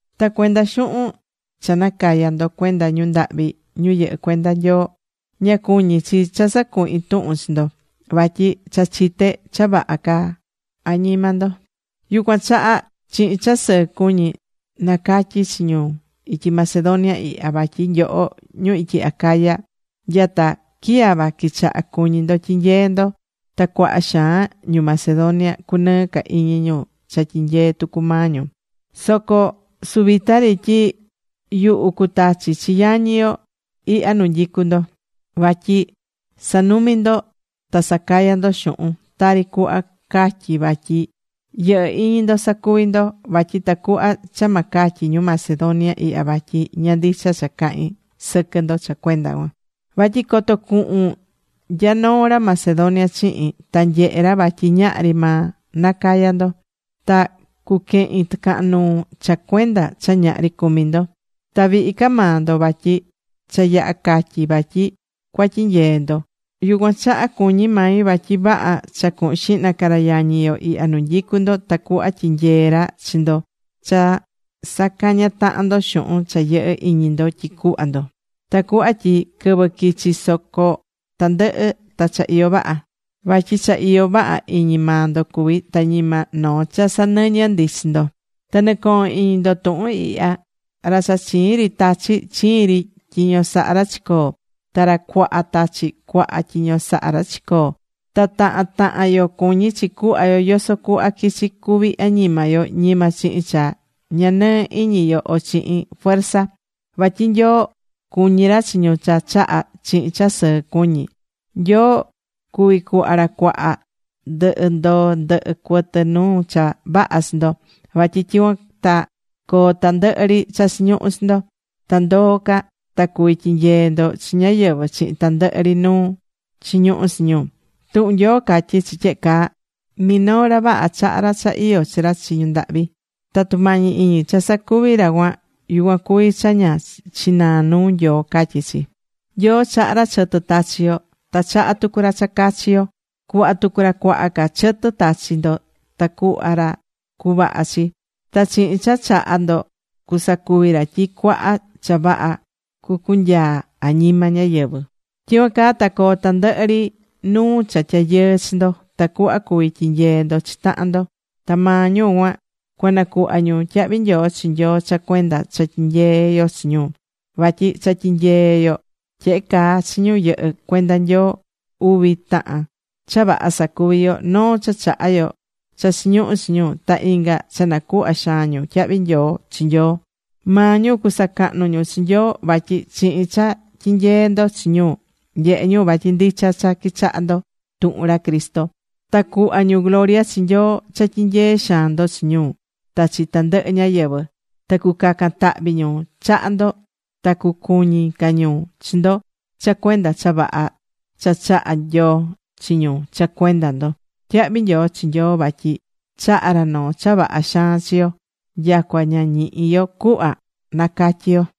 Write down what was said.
Ta cuenda xuhun cha nacayá ndo cuenda ñu ndahvi ñu yɨhɨ́ cuenda Nyoo, ña cuñí chi cha sacuhin tuhun chi ndo. Vatyi cha chité cha vaha caá añima ndo. Yucuan chaha chihin cha sɨɨ cuñí nacatyí chi ñu ityi Macedonia ihya, vatyi nyoho ñu ityi Acaya, nya ta quiyava quichaha cuñí ndo tyinyeé ndo. Ta cuaha xaan ñu Macedonia cunɨɨ ca iñi ñu cha tyinyeé tucu maa ñu. Soco suvita ri yuhu cutachi chi yañi yo ihya nu nyicú ndo. Vatyi sa̱numi ndo ta sa̱caya ndo xuhun, tari cuhva catyí vatyi yɨhɨ́ iñi ndo sacuví ndo. Vatyi tacuhva cha ma catyi ñu Macedonia ihya vatyi ña ndicha cha cahín sɨquɨ ndo cha cuenda cuan. Vatyi coto cuhun nya noo ra Macedonia chihin, ta nyehe ra vatyi ñahri maa nacayá ndo. Ta cuquehin tɨcahan nuu cha cuenda cha ñahri cumi ndo. Ta vihi ca maa ndo. Vatyi cha yaha catyi̱ vatyi cuatyinyee ndo. Yucuan chaha cuñí mai vatyi vaha cha cuhun xihna ca ra yañi yo ihya nu nyicú ndo tacuhva tyinyeé ra chi ndo cha sacañá tahan ndo xuhun cha yɨhɨ́ iñi ndo tyi cuhva ndo. Tacuhva tyi quɨvɨ quichi soco tandɨhɨ ta cha iyó vaha. Vatyi cha iyó vaha iñi maa ndo cuví, ta ñima noo cha sanɨñɨ ndi chi ndo. Ta nɨ̱cohon iñi ndo tuhun ihya: Ra cha chiin ri tachí, chiin ri tyiño sahá ra chicoó. Ta ra cuaha tachí, cuaha tyiño sahá ra chicoó. Ta tahan tahan yo cuñí chi cuhva yo yoso cuhva quichi cuvi añima yo. Ñima chihin cha ña nɨɨ iñi yo o chihin fuerza. Vatyi Nyoo cuñí ra chi ñu cha chahá chihin cha sɨɨ cuñí. Nyoo cuví cuhva ra cuaha, ndɨhɨ ndoo ndɨhɨ cuɨtɨ nuu cha vaha chi ndo. Vatyi tyicuan ta coo tandɨhɨ ri cha chiñuhú chi ndo. Ta ndoo ca ta cuví tyinyee ndo chi ñáyɨvɨ chihin tandɨhɨ ri nuu chiñuhú chi ñu. Tuhun Nyoo catyí chi tyehe caa: Minoo ra vaha, chahá ra cha iyó chi ra chi ñu ndahvi. Ta tumañi iñi cha sacuví ra cuan, yucuan cuví cha ña chinaá nuu Nyoo, catyí chi. Nyoo chahá ra chɨtɨ tachí yo. Ta chahá tucu ra cha cachi yo. Cuhva tucu ra cuaha ca chɨtɨ tachi ndo ta cuhva ra cuvaha chi. Ta chihin cha chahá ndo, cusacuvi ra tyi cuaha cha vaha cucunyaa añima ñáyɨvɨ. Tyicuan caa ta coo tandɨhɨ ri nuu cha tyayɨɨ chi ndo, tacuhva cuvi tyinyee ndo chi tahan ndo. Ta maa ñu cuan, cuanacuhva ñu tyahvi nyoo chi Nyoo cha cuenda cha tyinyeé yo chi ñu. Vatyi cha tyinyeé yo tyehe caa chi ñu yɨhɨ́ cuenda Nyoo, uvi tahan cha vaha sacuví yo. Noo cha chahá yo cha chiñuhú chi ñu. Ta inga cha nacuhvá xaan ñu tyahvi nyoo chi Nyoo. Maa ñu cusacahnu ñu chi Nyoo. Vatyi chihin cha tyinyeé ndo chi ñu, nyehé ñu vatyi ndicha cha quichahá ndo tuhun ra Cristo. Ta cuhva ñu gloria chi Nyoo cha tyinyeé xaan ndo chi ñu ta chi tandɨhɨ ñáyɨvɨ. Ta cucacan tahvi ñu chaha ndo. Ta cucuñi ca ñu chi ndo cha cuenda cha vaha cha chahá Nyoo chi ñu cha cuenda ndo. Tyahvi nyoo chi Nyoo vatyi chahá ra noo cha vaha xaan chi yo. Nyacua ña ñihí yo cuhva nacatyí yo.